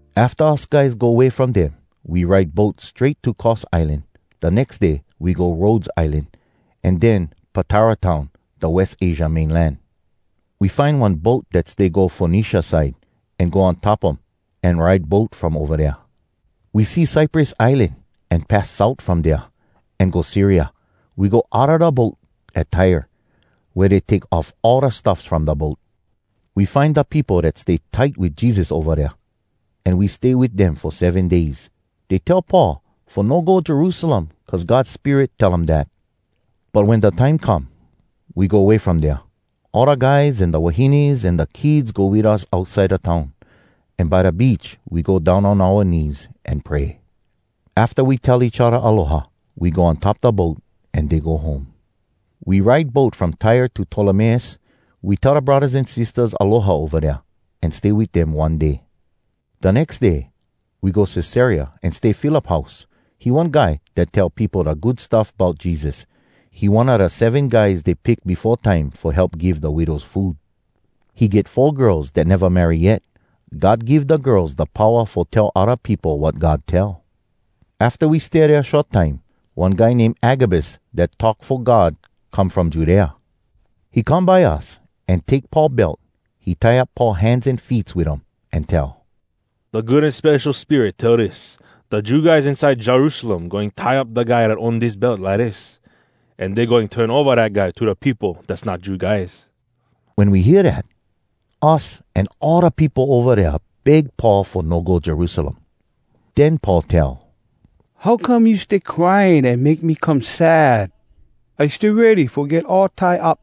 Afta us guys go way from dem, we ride boat strait to Cos Islan. Da nex day we go Rhodes Islan, an den Patara town, da West Asia mainland. We find one boat dat stay go Fonecia side, an go on top um an ride boat from ova dea. We see Cyprus Islan, an pass south from dea, an go Syria. We go outa da boat at Tyre, wea dey take off all da stuffs from da boat. We find da peopo dat stay tight wit Jesus ova dea, an we stay wit dem fo seven days. Dey tell Paul fo no go Jerusalem cuz God Spirit tell um dat. But wen da time come, we go way from dea. All da guys an da wahines an da kids go wit us outside da town. An by da beach we go down on oua knees an pray. Afta we tell each odda aloha, we go on top da boat, an dey go home. We ride boat from Tyre to Tolemais. We tell da braddahs an sistahs aloha ova dea, an stay wit dem one day. Da nex day we go Cesarea an stay Philip house. He one guy dat tell peopo da Good Stuff Bout Jesus. He one a da Seven guys dey pick befo time fo help give da widows food. He get four girls dat neva marry yet. God give da girls da powa fo tell odda peopo wat God tell. Afta we stay dea short time, one guy name Agabus dat talk fo God come from Judea. He come by us, an take Paul belt. He tie up Paul hands an feets wit um, an tell, “da Good An Spesho Spirit tell dis, ‘Da Jew guys inside Jerusalem goin tie up da guy dat own dis belt lidis. An dey goin turn ova dat guy to da peopo dass not Jew guys.’” Wen we hear dat, us an all da peopo ova dea beg Paul fo no go Jerusalem. Den Paul tell, “How come you stay crying an make me come sad? I stay ready fo get all tie up,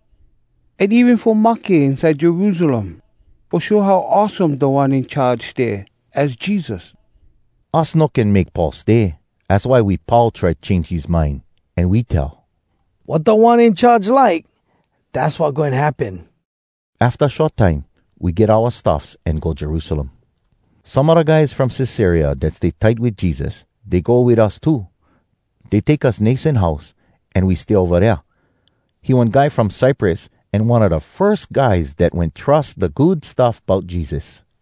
an even fo mahke inside Jerusalem, fo show how awesome Da One In Charge stay, az Jesus.” Us no can make Paul stay, az why we pau try change his mind. An we tell, “Wat Da One In Charge like, dass wat goin happen.” Afta short time, we get oua stuffs an go Jerusalem. Some a da guys from Cesarea dat stay tight wit Jesus, dey go wit us too. Dey take us Mnason house, an we stay ova dea. He one guy from Cyprus an one a da firs guys dat wen trus da Good Stuff Bout Jesus.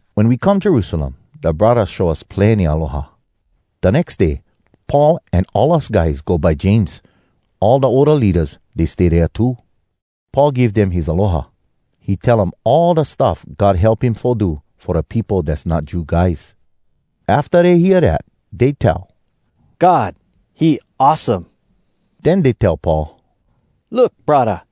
Wen we come Jerusalem, da braddahs show us plenny aloha. Da nex day Paul an all us guys go by James. All da older leadas, dey stay dea too. Paul give dem his aloha. He tell um all da stuff God help him fo do fo da peopo dass not Jew guys. Afta dey hear dat, dey tell, “God, he awesome!” Den dey tell Paul, “Look, braddah,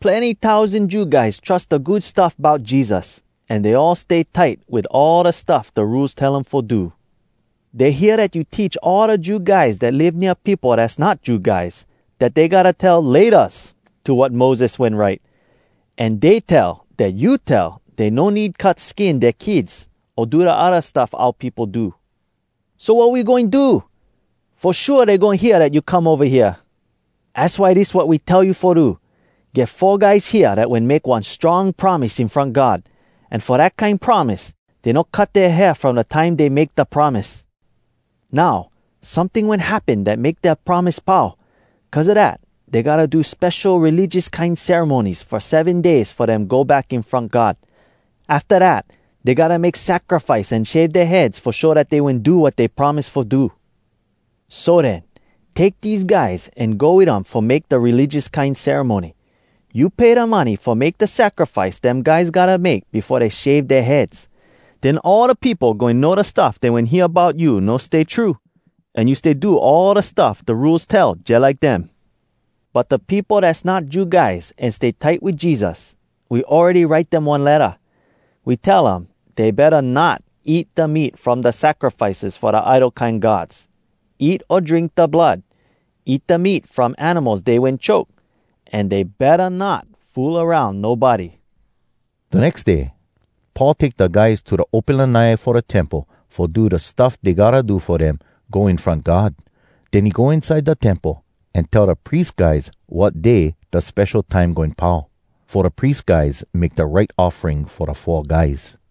plenny tousan Jew guys trus da Good Stuff Bout Jesus. An dey all stay tight wit all da stuff da Rules tell um fo do. Dey hear dat you teach all da Jew guys dat live nea peopo dass not Jew guys, dat dey gotta tell ‘Laytas’ to wat Moses wen write. An dey tell dat you tell dey no need cut skin dea kids, o do da odda stuff oua peopo do. “So, wat we goin do? Fo shua dey goin hear dat you come ova hea. Az why dis wat we tell you fo do. Get four guys hea dat wen make one strong promise in front God. An fo dat kine promise, dey no cut dea hair from da time dey make da promise. Now, someting wen happen dat make dea promise pau. Cuz a dat, dey gotta do spesho religious kine ceremonies fo seven days fo dem go back in front God. Afta dat, dey gotta make sacrifice an shave dea heads fo show dat dey wen do wat dey promise fo do. So den, take dese guys an go wit um fo make da religious kine ceremony. You pay da money fo make da sacrifice dem guys gotta make befo dey shave dea heads. Den all da peopo goin know da stuff dey wen hear bout you no stay true, an you stay do all da stuff da Rules tell jalike dem. But da peopo dass not Jew guys an stay tight wit Jesus, we awready write dem one letta. We tell um dey betta not eat da meat from da sacrifices fo da idol kine gods, eat o drink da blood, eat da meat from animals dey wen choke, an dey betta not fool aroun nobody.” Da nex day, Paul take da guys to da open lanai fo da Temple fo do da stuff dey gotta do fo dem go in front God. Den he go inside da temple an tell da pries guys wat day da spesho time goin pau, fo da pries guys make da right offering fo da four guys.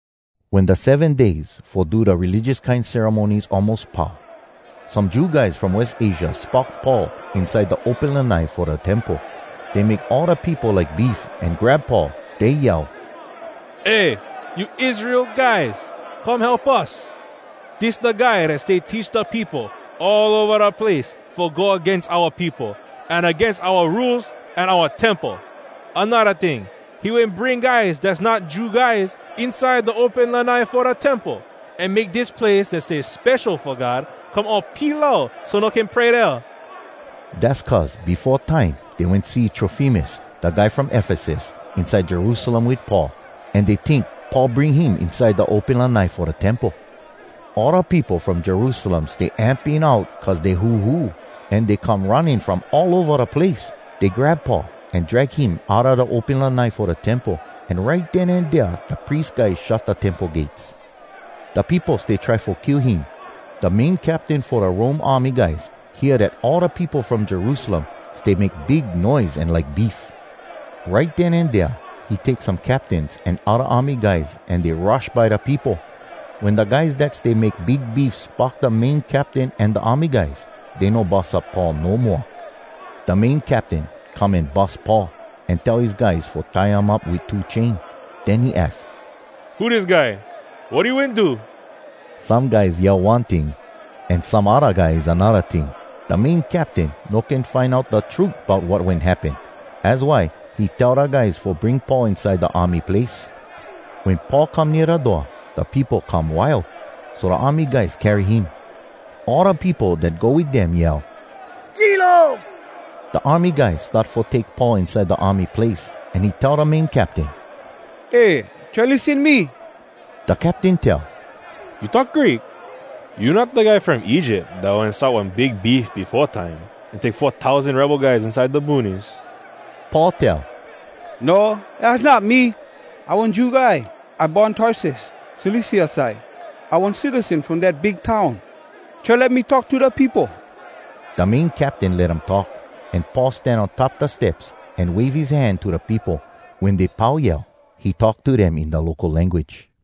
Wen da seven days fo do da religious kine ceremonies almos pau, some Jew guys from West Asia spock Paul inside da open lanai fo da Temple. Dey make all da peopo like beef, an grab Paul. Dey yell, “Eh! You Israel guys! Come help us! Dis da guy dat stay teach da peopo all ova da place fo go agains oua peopo, an agains oua Rules an oua Temple. Anodda ting, he wen bring guys dass not Jew guys inside da open lanai fo da Temple, an make dis place dat stay spesho fo God come all pilau so no can pray dea.” (Dass cuz befo time dey wen see Trofimus, da guy from Efesus, inside Jerusalem wit Paul, an dey tink Paul bring him inside da open lanai fo da Temple.) All da peopo from Jerusalem stay amping out cuz dey huhu, an dey come running from all ova da place. Dey grab Paul an drag him outa da open lanai fo da Temple. An right den an dea da pries guys shut da Temple gates. Da peopo stay try fo kill him. Da main captain fo da Rome army guys hear dat all da peopo from Jerusalem stay make big noise an like beef. Right den an dea he take some captains an odda army guys an dey rush by da peopo. Wen da guys dat stay make big beef spock da main captain an da army guys, dey no bus up Paul no moa. Da main captain come an bus Paul, an tell his guys fo tie um up wit two chain. Den he aks, “Who dis guy? Wat he wen do?” Some guys yell one ting, an some odda guys anodda ting. Da main captain no can find out da trut bout wat wen happen. Az why he tell da guys fo bring Paul inside da army place. Wen Paul come nea da door, da peopo come wild, so da army guys carry him. All da peopo dat go wit dem yell, “Kill um!” Da army guys start fo take Paul inside da army place, an he tell da main captain, “Eh, try lissen me!” Da captain tell, “You talk Greek? You not da guy from Egypt dat wen start one big beef befo time, an take four tousan rebel guys inside da boonies?” Paul tell, “No, az not me! I one Jew guy. I born Tarsus, Cilicia side. I one citizen from dat big town. Try let me talk to da peopo.” Da main captain let um talk, an Paul stan on top da steps, an wave his hand to da peopo. Wen dey pau yell, he talk to dem in da local language.